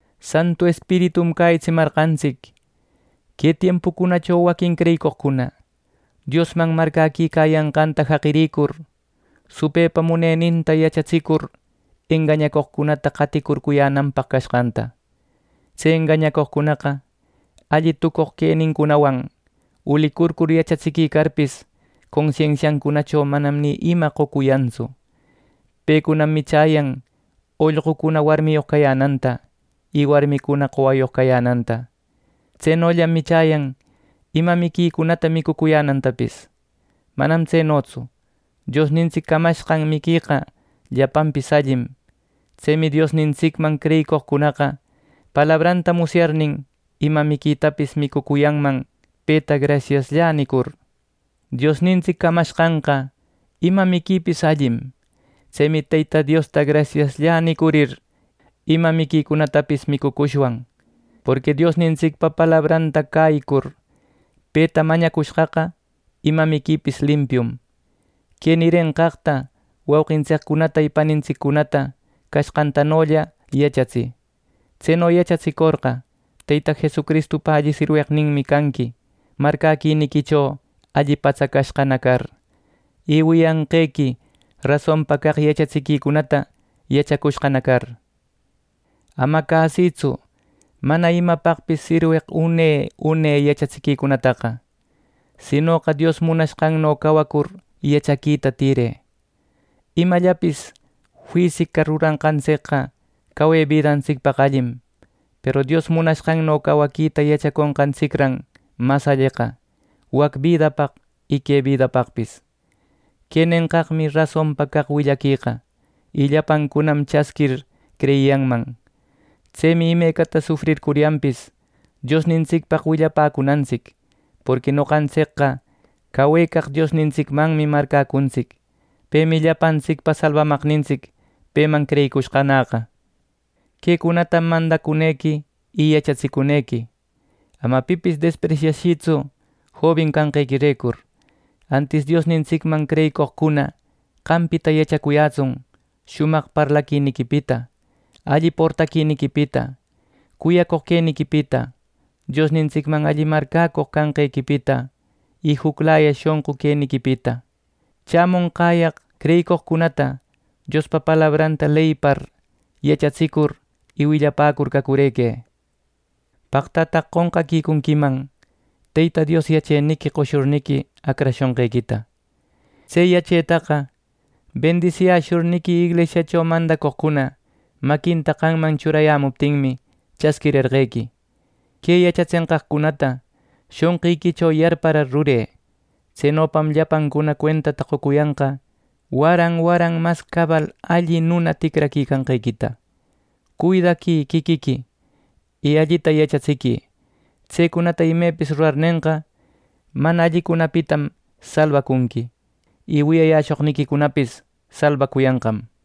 Santu Espiritum cäyitsimarqantsic que tiempucunacho waquin creyicoqcuna Diosman marcäquicayanqanta jaqirïcur supëpa muneninta yachatsicur engañacoqcunata qaticurcuyänanpaq cashqanta. Tse engañacoqcunaqa, alli tucoq quenincunawan ulicurcur yachatsiquicarpis, consensiancunacho manam ni ima qocuyantsu. Pecunam michäyan ollqucuna warmiyoq cayänanta, y warmicuna qowayoq cayänanta. Tsenollam michäyan ima miquicunata micucuyänantapis. ¡Manam tsenotsu! Diosnintsic camashqan miqueqa llapanpis allim. Tsemi Diosnintsicman creyicoqcunaqa palabranta musyarnin, ima miquitapis micucuyanman peta “Grasiasllä” nicur. Diosnintsic camashqanqa ima miquipis allim. Tsemi Teyta Diosta “Grasiasllä” nicurir, ima miquicunatapis micucushwan; porqui Diosnintsicpa palabranta cäyicur, peta mañacushqaqa, ima miquipis limpium. Que nirenqaqta wauqintsiccunata y panintsiccunata cashqantanolla yachatsï. Tseno yachatsicorqa, Teyta Jesucristupa alli sirweqninmi canqui marcäquiniquicho alli patsacashqana car, y wiyanqequi rasonpa caq yachatsiquicunata yachacushqana car. Ama cäsïtsu mana imapaqpis sirweq une une yachatsiquicunataqa; sinoqa Dios munanqanno cawacur yachaquita tïrë. Imallapis fisica ruranqantsicqa cawe bidantsicpaq allim; peru Dios munanqanno cawaquita yachaconqantsicran mas alleqa, wac bidapaq y que bidapaqpis. Que nenqaqmi rasonpa caq willaqueqa, y llapancunam chasquir creyiyanman. Tsemi imecata sufrircuryanpis Diosnintsicpaq willapäcuntsic; porqui noqantsicqa cawecaq Diosnintsicmanmi marcäcuntsic. Pemi llapantsicpa Salbamaqnintsic, peman creyicushqanäqa. Quecunatam mandacunequi y yachatsicunequi. Ama pipis despresyashïtsu jobin canqequirecur; antis Diosnintsicman creyicoqcuna qampita yachacuyätsun shumaq parlaquiniquipita, alli portaquiniquipita, cuyacoq queniquipita, Diosnintsicman alli marcäcoq canqequipita y juclaya shonqu queniquipita. Chämonqäyaq, creyicoqcunata Diospa palabranta leyipar, yachatsicur y willapäcur cacurëquë. Paqtataq qonqaquicunquiman Teyta Dios yacheniqui qoshurniqui acrashonqequita. Tse yachetaqa bendisiyäshurniqui inglisiacho mandacoqcuna maquinta qamman churayämuptinmi chasquirerqequi. Que yachatsenqaqcunata shonqiquicho yarparar rurë. Tsenopam llapancuna cuentata qocuyanqa waran waran mas cabal alli nuna ticraquicanqequita. Cuidaquï quiquiqui, y allita yachatsiquï. Tsecunata imepis rurarnenqa, mana allicunapitam salbacunqui, y wiyayäshoqniquicunapis salbacuyanqam.